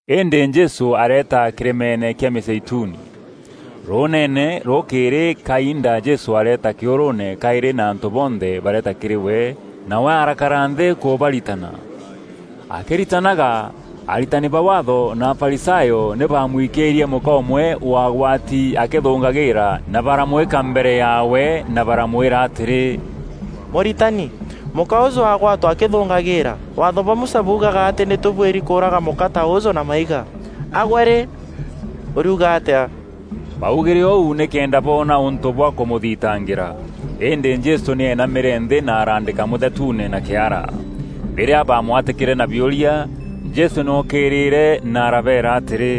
Îndî Jesû areeta kîrîmeene kîa Mîzeituni. Rûûneene, rûkîîrî kainda Jesû areeta kîûrûûne kaîrî na antû bonthe bareeta kîrî we, nawe arakara nthî kûbaritana. Akîritanaga, aritani ba Waatho na Afarisayo nî baamwikîîrie mûka ûmwe waagwati akithûngagîîra na baramwîka mbere yaawe na baramwîra atîrî, “Mûritani, mûka ûûjû aagwatwa akîthûngagîîra. Waatho bwa Musa buugaga atî nî tûbuîri kûûraga mûka ta ûûjû na maiga. A gwe rî, ûriuga atîa?” Baugîre ûu nîkenda boona ûntû bwa kûmûthitangîra. Îndî Jesû nî eenamîîrie nthî na araandîka mûthetuune na kîara. Rîrîa baamwatîkîre na biûria, Jesû nî ookîîrîre na arabeera atîrî,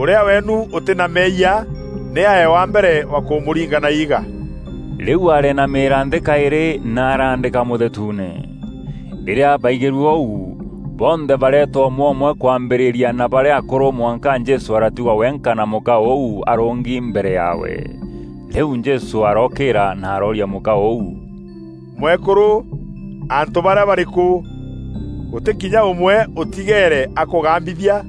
“Ûrîa weenu ûtî na meeyia, nî aee wa mbere kûmûringa na iiga.” Rîu areenamîîria nthî kaîrî, na araandîka mûthetuune. Rîrîa baigîrue ûu, bonthe bareeta ûmwe ûmwe kwambîrîria na barîa akûrû mwanka Jesû aratigwa wenka na mûka ûu arûngi mbere yaawe. Rîu Jesû arookîîra na arooria mûka ûu, “Mwekûrû, antû barîa barîkû? Gûtî kinya ûmwe ûtigeere akûgambithia?”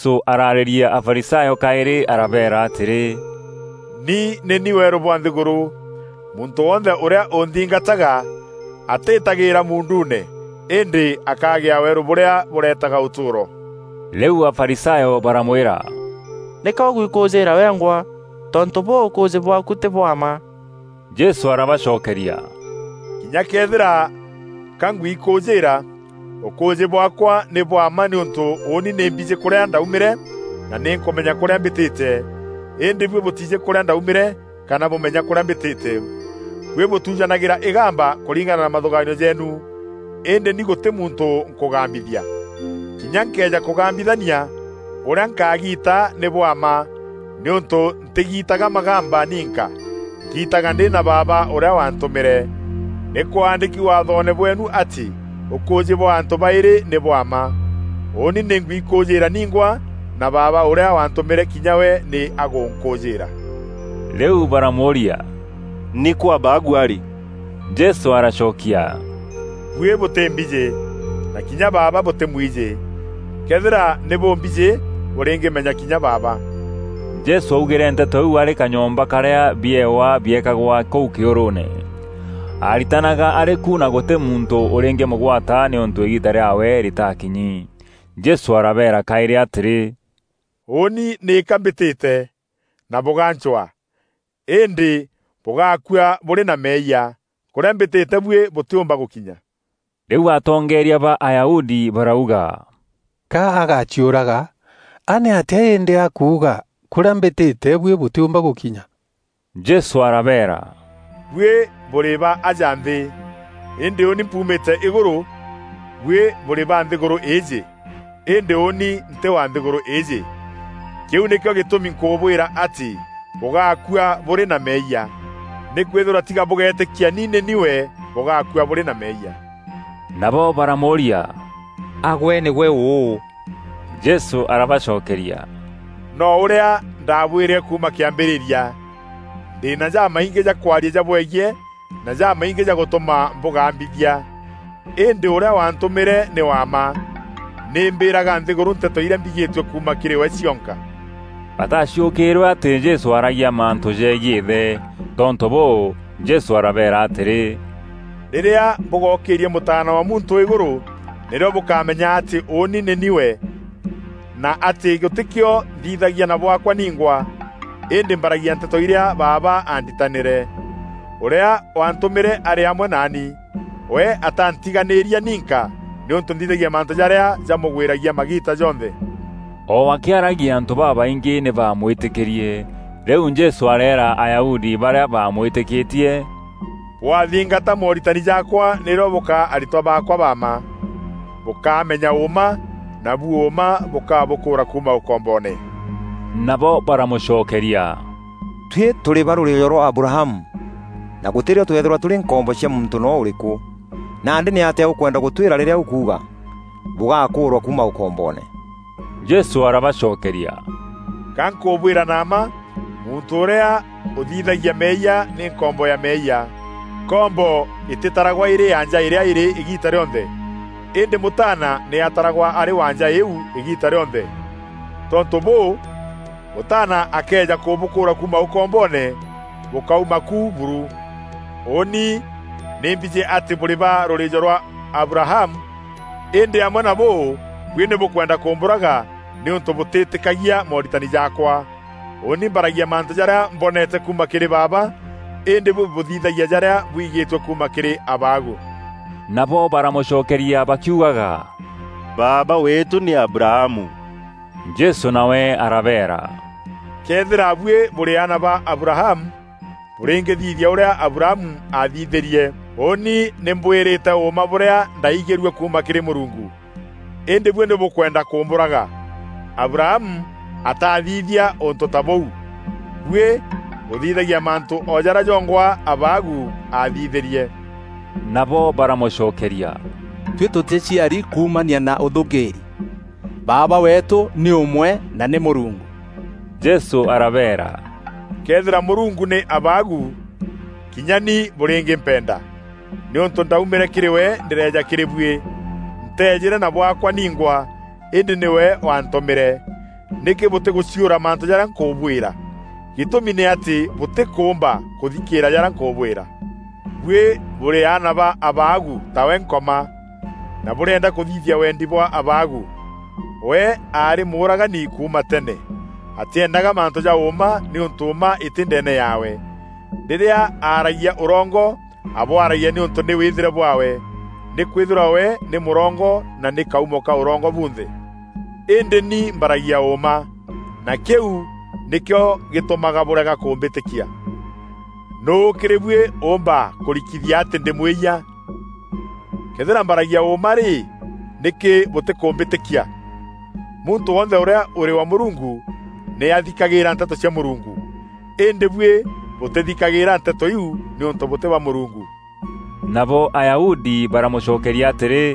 Jesû ararîîria Afarisayo kaîrî arabeera atîrî, “Ni nî ni weerû bwa nthîgûrû. Muntû wonthe ûrîa ûnthingataga atiitagîîra muunduune, îndî akagîa weerû bûrîa bûretaga ûtûûro.” Rîu Afarisayo baramwîra, “Nîka ûgwikûûjîîra wengwa tontû bûû ûkûûjî bwaaku tî bwa mma.” Jesû arabacokeria, “Kinya këethîra ka ngwikûûjîîra, ûkûûjî bwaakwa nî bwa mma nîûntû ûûni nî mbijî kûrîa ndaumîre na nî nkûmenya kûrîa mbîtîte. Îndî buî bûtiijî kûrîa ndaaumîre kana bûmenya kûrîa mbîtîte. Buî bûtujanagîra îgamba kûringana na mathûgaanio jeenu, îndî ni gûtî muntû nkûgambithia. Kinya nkëeja kûgambithania, ûrîa nkagiita nî bwa mma nîûntû ntîgiitaga magamba ninka. Ngiitaga ndî na Baaba ûrîa waantûmîre. Nî kwaandîki Waathoone bweenu atî ûkûûjî bwa antû baîrî nî bwa mma. Ûûni nî ngwikûûjîîra ningwa, na Baaba ûrîa waantûmîre kinya we nî agûnkûûjîîra.” Rîu baramûûria, “Nîkû Abaagu arî?” Jesû aracokia, “Buî bûtîmbijî, na kinya Baaba bûtîmwijî. Këethîra nî bûmbijî, bûrîngîmenya kinya Baaba.” Jesû augîre nteto iu arî kanyomba karîa biewa biekagwa kûu kîûrûûne. Aaritanaga arî ku na gûtî muntû ûrîngîmûgwata nîûntû îgiita rîaawe rîtaakinyi. Jesû arabeera kaîrî atîrî, “Ûûni nîka mbîtîte, na bûgancwaa, îndî bûgaakua bûrî na meeyia. Kûrîa mbîtîte buî bûtîumba gûkinya.” Rîu atongeeria ba Ayahudi barauga, “Ka agaciûraga? A nîatîa îndî akuuga: ‘Kûrîa mbîtîte buî bûtîûmba gûkinya?’” Jesû arabeera, “Buî bûrî ba aja nthî, îndî ûûni mpuumîte îgûrû; buî bûrî ba nthîgûrû îîjî, îndî ûûni ntî wa nthîgûrû îîjî. Kîu nîkîo gîtûmi nkûbwîra atî bûgaakua bûrî na meeyia. Nîkwîthîrwa tiga bûgeetîkia ni nî ni we, bûgaakua bûrî na meeyia.” Nabo baramûûria, “A gwe nîgwe ûû?” Jesû arabacokeria, “No ûrîa ndaabwîrîre kuuma kîambîrîria! Ndî na jamaingî ja kwaria jabwegiî na jamaingî jagûtûma mbûgambithia. Îndî ûrîa waantûmîre nî wa mma. Nî mbîraga nthîgûrû nteto irîa mbigîtue kuuma kîrî we cionka.” Bataaciûkîîrwe atî Jesû aaragia mantû jegiî Îthe. Tontû bûû, Jesû arabeera atîrî, “Rîrîa bûgookîîria Mûtaana wa Muntû îgûrû, nîrîo bûkamenya atî ‘Ûûni nî ni we,’ na atî gûtîkîo nthithagia na bwaakwa ningwa, îndî mbaragia nteto irîa Baaba aanditanîre. Ûrîa waantûmîre arî amwe naani; we ataantiganîria ninka nîûntû nthithagia mantû jarîa jamûgwîragia magiita jonthe.” O akîaragia antû babaingî nî baamwîtîkîrie. Rîu Jesû areera Ayahudi barîa bamwîtîkîtie, “Bwathingata mooritani jaakwa nîrîo bûkaa aritwa baakwa ba mma. Bûkamenya ûûma, nabu ûûma bûkabûkûûra kuuma ûkomboone.” Nabo baramûcokeria, “Tuî tûrî ba rûrîîjo rwa Abrahamu, na gûtî rîo tweethîrwa tûrî nkombo cia muntû noo ûrîkû. Nandî nîatîa ûkwenda gûtwîra rîrîa ûkuuga: ‘Bûgakûûrwa kuuma ûkomboone!’” Jesû arabacokeria, “Ga nkûbwîra na mma, muntû ûrîa ûthithagia meeyia nî nkombo ya meeyia. Nkombo îtîtaragwa îrî ya nja îrîa îrî îgiita rîonthe, îndî mûtaana nî ataragwa arî wa nja îîu îgiita rîonthe. Tontû bûû, Mûtaana akëeja kûbûkûûra kuuma ûkomboone, bûkauma ku buru. Ûûni nî mbijî atî bûrî ba rûrîîjo rwa Abrahamu îndî amwe na bûu buî nî bûkwenda kûmbûraga nîûntû bûtîtîkagia mooritani jaakwa. Ûûni mbaragia mantû jarîa mboneete kuuma kîrî Baaba, îndî buî bûthithagia jarîa bwigîtue kuuma kîrî abaagu.” Nabo baramûcokeria bakiugaga, “Baaba weetû nî Abrahamu.” Jesû nawe arabeera, “Këethîra buî bûrî aana ba Abrahamu, bûrîngîthithia ûrîa Abrahamu aathithîrie. Ûûni nî mbwîrîte ûûma bûrîa ndaaigîrue kuuma kîrî Mûrungu; îndî buî nî bûkwenda kûmbûraga. Abrahamu ataathithia ûntû ta bûu. Buî bûthithagîa mantû o jarîa jongwa abaagu aathithîrie.” Nabo baramûcokeria, “Tuî tûtîciaari kumaania na ûthûûngîîri. Baaba weetû nî ûmwe na nî Mûrungu.” Jesû arabeera, “Këethîra Mûrungu nî abaagu, kinya ni bûrîngîmpenda, nîûntû ndaumîre kîrî we ndîreeja kîrî buî. Nteejîre na bwaakwa ningwa, îndî nîwe waantûmîre. Nîkî bûtîgûciûra mantû jarîa nkûbwîra? Gîtûmi nî atî bûtîkûûmba kûthikîîra jarîa nkûbwîra. Buî bûrî aana ba abaagu tawe Nkoma, na bûrîenda kûthithia wendî bwa abaagu. We aarî mûûragani kuuma tene; atîeendaga mantû ja ûûma nîûntû mma îtî ndeene yaawe. Rîrîa aaragia ûrongo, abwaragia nîûntû nî wîthîre bwaawe. Nîkwîthîrwa we nî mûrongo na nî kaumo ka ûrongo bunthe. Îndî ni mbaragia ûûma, na kîu nîkîo gîtûmaga bûrega kûmbîtîkia. Nûû kîrî buî ûûmba kûrikithia atî ndî mwîyia? Këethîra mbaragia ûûma rî, nîkî bûtîkûmbîtîkia? Muntû wonthe ûrîa ûrî wa Mûrungu nî athikagîîra nteto cia Mûrungu. Îndî buî bûtîthikagîîra nteto iu nîûntû bûtî ba Mûrungu.” Nabo Ayahudi baramûcokeria atîrî,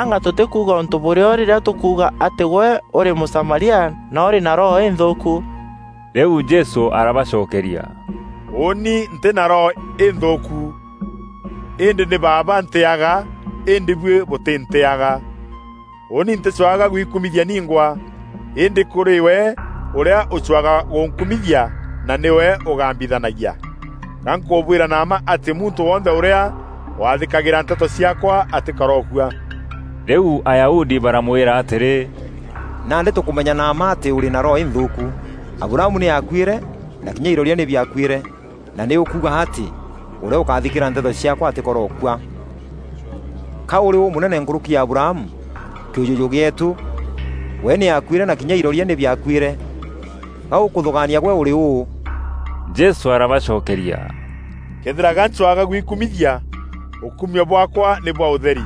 “Anga tûtî kuuga ûntû bûrîo rîrîa tûkuuga atî gwe ûrî Mûsamaria na ûrî na roho înthûûku?” Rîu Jesû arabacokeria, “Ûûni ntî na roho înthûûku îndî nî Baaba ntîîaga îndî buî bûtîntîîaga. Ûûni ntîcwaga gwikumithia ningwa, îndî kûrî we ûrîa ûcwaga gûnkumithia na nîwe ûgambithanagia. Ga nkûbwîra na mma atî muntû wonthe ûrîa waathîkagîra nteto ciaakwa atîkorookua.” Rîu Ayahudi baramwîra atîrî, “Nandî tûkûmenya na mma atî ûrî na roho înthûûku. Abrahamu nî aakuîre, na kinya iroria nî biakuîre, na nî ûkuuga atî, ‘Ûrîa ûkaathîkîra nteto ciaakwa atîkorookua!’ Ka ûrî ûmûnene nkûrûki ya Abrahamu, kîûjûjû gîeetû? We nî akuîre na kinya iroria nî biakuîre. Gaûkûthûgaania gwe ûrî ûû?” Jesû arabacokeria, “Këethîra ga ncwaga gwikumithia, ûkumio bwaakwa nî bwa ûtheri.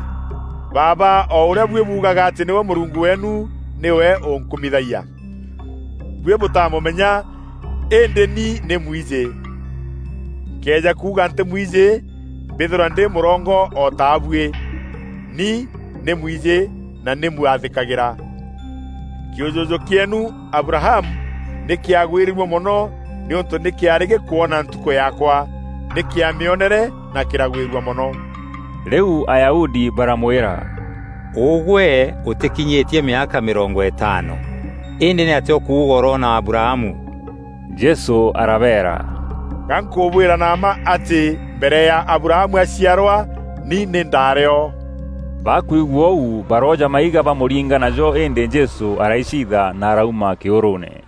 Baaba o ûrîa buî buugaga atî nîwe Mûrungu weenu, nîwe ûnkumithagia. Buî bûtamûmenya îndî ni nî mwijî. Nkëeja kuuga ntîmwijî mbîthîrwa ndî mûrongo o ta buî. Ni nî mwijî na nî mwathîkagîra. Kîûjûjû kîeenu, Abrahamu nî kîagwîrîrue mono nîûntû nî kîaarî gîkoona ntukû yaakwa. Nî kîamîonere na kîragwîrua mono.” Rîu Ayahudi baramwîra “Ûgwe ûtîkinyîtie mîaka mîrongo îtaano. Îndî nîatîa ûkuuga ûroona Abrahamu?” Jesû arabeera, “Ga nkûbwîra na mma atî mbere ya Abrahamu aciarwa, ni nî ndaarî o.” Bakwigua ûu barooja maiga bamûringa najo îndî Jesû araiciitha na arauma kîûrûûne.